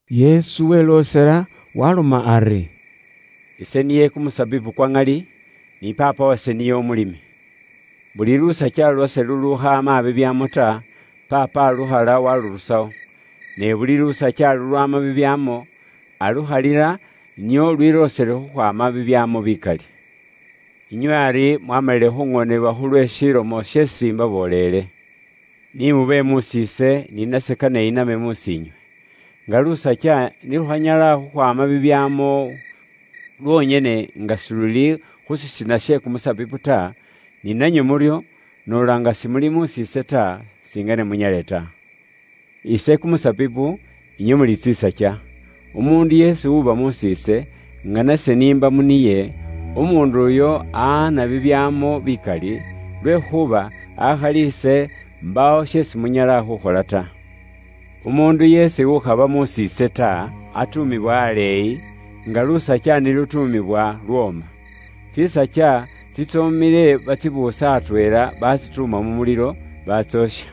Yesu weloosela, waaloma ari, “Ise niye kumusabibu kwa ŋali, ni Paapa wase niye umulimi. Buli lusakya lwase lulukhaama bibyaamo ta, Paapa alukhala walurusawo. Ne buli lusakya lulwaama bibyaamo, alukhalila nio lwiloosele khukhwaama bibyaamo bikali. Inywe ari mwaamalile khuŋoonebwa khulwe shilomo sheesi imbaboolele. Ni mube mus'iise, ni nase kane iname mus'iinywe. Nga lusakya ni lukhanyala khukhwaama bibyaamo lwonyene nga siluli khu shisina she kumusabibu ta, ni nanywe muryo, noola nga simuli mus'iise ta, singane munyale ta. “Ise kumusabibu, inywe muli tsisakya. Umuundu yeesi uba mus'iise, nga nase n'imba mu niye, umuundu uyo amakho bibyaamo bikali, lwekhuuba akhali ise, mbaawo sheesi munyala khukhola ta. Umuundu yeesi ukhaba mus'iise, atuumibwa aleeyi, nga lusakya ni lutuumibwa, lwooma. Tsisakya tsitsoomile batsibuusa atweela, batsituuma mu mulilo, batsoosha.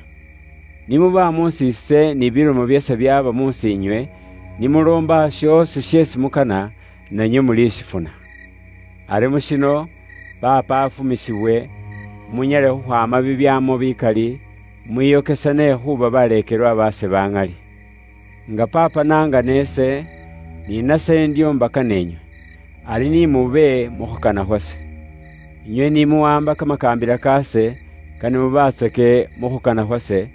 Ni muba mus'iise ni bilomo byase byaaba musinywe, ni muloomba shoosi sheesi mukana, nanywe mulishifuna. Ari mu shino, Paapa afumisibwe, munyale khukhwaama bibyaamo bikali, mwiyokesane khuuba baleekelwa baase baŋali. Nga Paapa n'angana ise, ni nase ndyo nabakana inywe. Ari ni mube mu khukana khwase. Inywe ni muwaamba kamakaambila kaase, kane mubaatsake mu khukana khwase,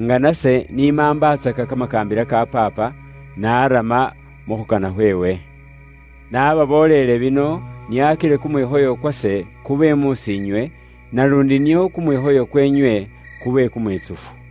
nga nase ni maambatsaka kamakaambila ka Paapa, naarama mu khukana khweewe. Nababoolele bino nio akile kumwikhoyo kwase kube mus'iinywe, naluundi nio kumwikhoyo kweenywe kube kumwitsufu.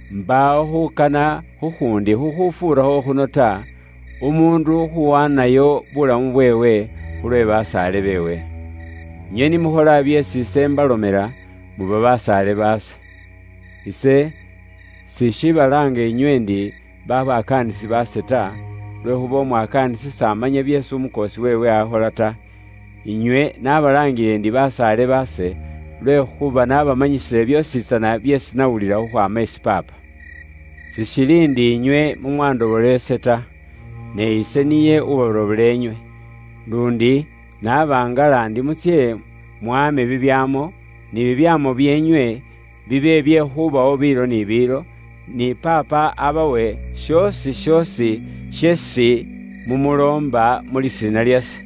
Mbaawo khukana khukhuundi khukhufuura khuno ta: umuundu khuwaanayo bulamu bweewe, khulwe basaale beewe. Inywe ni mukhola byeesi ise imbalomela, muba basaale baase. Ise sishiibalaanga nywe ndi babakaanisi baase ta, lwekhuuba umwakaanisi s'amanya byeesi umukoosi weewe akhola ta. Inywe nabalaangile ndi basaale baase lwekhuuba nabamanyisile byoositsana byeesi nawulila khukhwaama isi Paapa. Sishili ndi inywe mumwandobola ise ta, ne ise niye uwabarobola inywe. Luundi nabangala ndi mutsye mwame bibyaamo, ni bibyaamo byeenywe bibe bye khubawo biilo ni biilo, ni Paapa abawe shoosi shoosi, sheesi mumuloomba, mu lisiina lyase.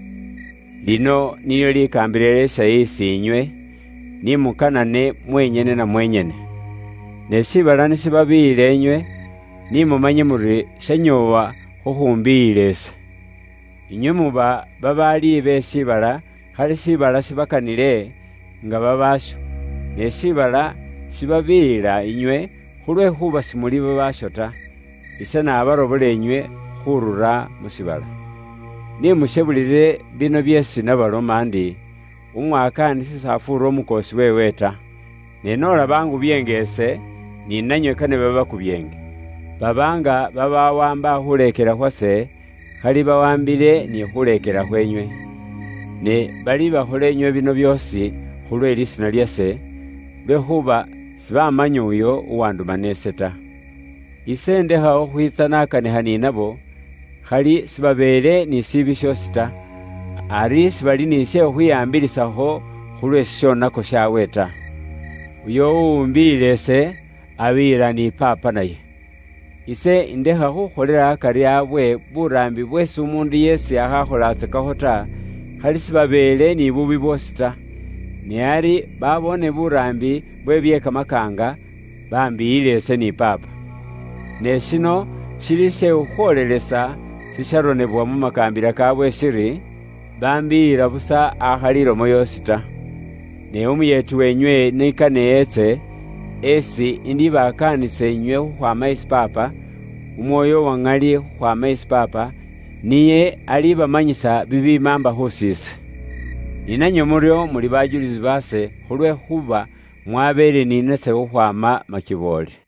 Lino nilyo likaambila lyase is'inywe: ni mukanane mwenyene na mwenyene. “Ne shiibala ni shibabiiyila inywe, ni mumanye muri shanyoowa khukhumbiyila ise. Inywe muba babaali be shiibala khali shiibala shibakanile, nga babaasho; ne shiibala shibabiiyila inywe khulwekhuuba simuli babaasho ta. Ise nabarobola nywe khurura mu shiibala. Ni mushebulile bino byeesi nabaloma ndi: umwakaanisi s'afuura umukoosi weewe ta. Ne noola baangubyeenga ise, ni nanywe kane babakubyeenge. Baba nga babawaamba khuleekela khwase, khali bawaambile ni khuleekela khwenywe. Ne balibakhola inywe bino byoosi khulwe lisiina lyase, lwekhuuba sibamanya Uyo uwandumana ise ta. Ise indekha khukhwiitsa nakanikha ni nabo, khali sibabeele ni shiibi shoosi ta. Ari sibali ni she khukhwihaambilisakho khulwe shishonako shabwe ta. Uyo uwumbiyila ise, abiyila ni Paapa naye. Ise ndekha khukholela akari abwe buraambi bweesi umuundu yeesi akhakholatsakakho ta, khali sibabeele ni kumusaango kwe bubwoonaki ta. Ne ari baboone buraambi bwe bye kamakaanga, bambiyila ise ni Paapa. Ne shino shili she khukhwoolelesa shisharonebwa mu makaambila kaabwe shiri: bambiyila busa akhali ilomo yoosi ta. “Ne Umuyeeti weenywe ni kane eetse, esi indibakaanisa inywe khukhwaama isi Paapa, Umwoyo uwa ŋali khukhwaama isi Paapa, niye alibamanyisa bibimaamba khus'ise. Ni nanywe muryo muli bajulisi baase khulwekhuuba mwabeele ni nase khukhwaama makiboole.”